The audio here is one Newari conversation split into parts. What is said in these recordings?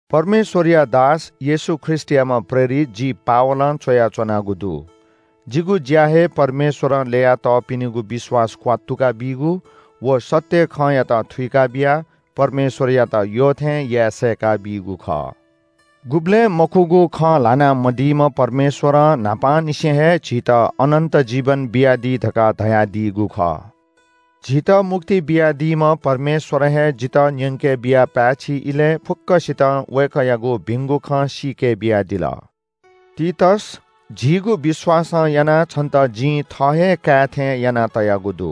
परमेश्‍वरया दास, येशू ख्रीष्‍टयाम्‍ह प्रेरित जि पावलं च्‍वयाच्‍वनागु दु। जिगु ज्‍या हे परमेश्‍वरं ल्‍यया तःपिनिगु विश्‍वास क्‍वात्तुका बीगु व सत्‍य खँयात थुइका बियाः परमेश्‍वरयात यःथें याये सय्‌का बीगु खः। गुबलें मखुगु खँ ल्‍हाना मदीम्‍ह परमेश्‍वरं न्‍हापांनिसें हे झीत अनन्‍त जीवन बियादी धकाः धयादीगु खः। झीत मुक्ति बियादीम्‍ह परमेश्‍वरं हे जितः न्‍यंके बियाः पाय्‌छि इलय् फुक्‍कसितं वय्‌कःयागु भिंगु खँ सीके बियादिल। तीतस, झीगु विश्‍वासं यानाः छन्‍त जिं थः हे काय् थें यानातयागु दु।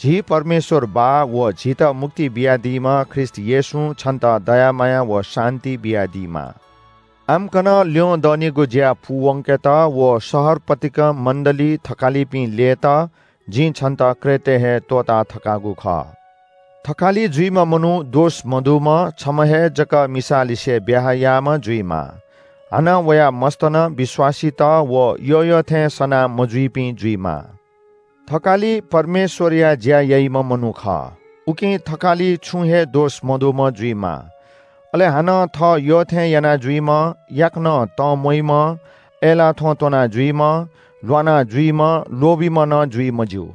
झी परमेश्‍वर बाः व झीत मुक्ति बियादीम्‍ह ख्रीष्‍ट येशूं छन्‍त दया माया व शान्‍ति बियादीमा। आम्‍कन ल्‍यंदनिगु ज्‍या पूवंकेत व शहर पतिकं मण्‍डलीइ थकालिपिं ल्‍ययेत जिं छन्‍त क्रेटय् हे त्‍वःता थकागु खः। थकालि जुइम्‍ह मनू दोष मदुम्‍ह, छम्‍ह हे जक मिसालिसे ब्‍याहा याःम्‍ह जुइमाः, हानं वया मस्‍त नं विश्‍वासीत व यःयःथें सना मजुइपिं जुइमाः। थकालि परमेश्‍वरया ज्‍या याइम्‍ह मनू खः। उकिं थकालि छुं हे दोष मदुम्‍ह जुइमाः। अले हानं थः यःथें यानाजुइम्‍ह, याकनं तंम्‍वइम्‍ह, अय्‌लाः थ्‍वँ त्‍वना जुइम्‍ह, ल्‍वाना जुइम्‍ह, लोभीम्‍ह नं जुइ मज्‍यू।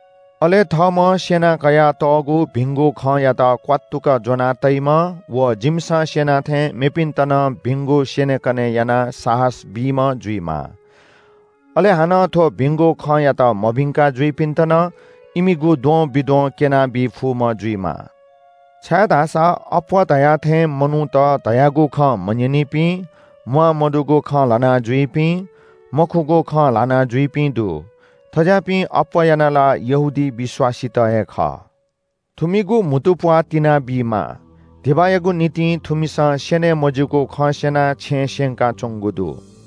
अले थःम्‍हं स्‍यनाकयातःगु भिंगु खँयात क्‍वात्तुक ज्‍वनातइम्‍ह व जिमिसं स्‍यना थें मेपिन्‍त नं भिंगु स्‍यनेकने यानाः साहस बीम्‍ह जुइमाः। अले हानं थ्‍व भिंगु खँयात मभिंकाः जुइपिन्‍त नं इमिगु द्वंबिद्वं क्‍यनाबी फुम्‍ह जुइमाः। छाय्‌धाःसा अप्‍वः धया थें मनूत धयागु खँ मन्‍यनीपिं, म्‍वाःमदुगु खँ ल्‍हानाजुइपिं, मखुगु खँ ल्‍हानाजुइपिं दु। थज्‍याःपिं अप्‍वः यानाः ला यहूदी विश्‍वासीत हे खः। थुमिगु म्‍हुतुप्‍वाः तिनाबीमाः। धिबायागु निंतिं थुमिसं स्‍यने मज्‍यूगु खँ स्‍यनाः छेँ स्‍यंकाच्‍वंगु दु।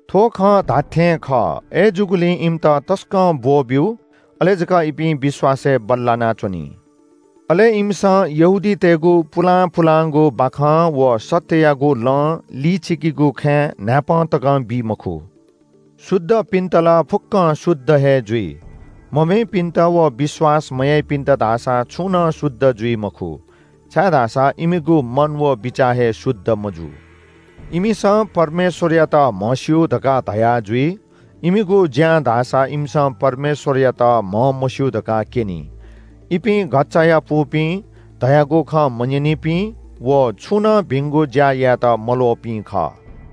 थ्‍व खँ धात्‍थें खः। अय्‌जूगुलिं इमित तसकं ब्‍वःब्‍यु, अले जक इपिं विश्‍वासय् बल्‍लाना च्‍वनी। अले इमिसं यहूदीतय्‌गु पुलां पुलांगु बाखं व सत्‍ययागु लं लिचिकीगु खँय् न्‍हाय्‌पं तकं बी मखु। शुद्धपिन्‍त ला फुक्‍कं शुद्ध हे जुइ। मभिंपिन्‍त व विश्‍वास मयाइपिन्‍त धाःसा छुं नं शुद्ध जुइ मखु, छाय्‌धाःसा इमिगु मन व बिचाः हे शुद्ध मजू। इमिसं परमेश्‍वरयात म्‍हस्‍यू धकाः धयाजुइ, इमिगु ज्‍यां धाःसा इमिसं परमेश्‍वरयात म्‍हमस्‍यू धकाः क्‍यनी। इपिं घच्‍चायापुपिं, धयागु खँ मन्‍यनीपिं व छुं नं भिंगु ज्‍या यायेत मल्‍वःपिं खः।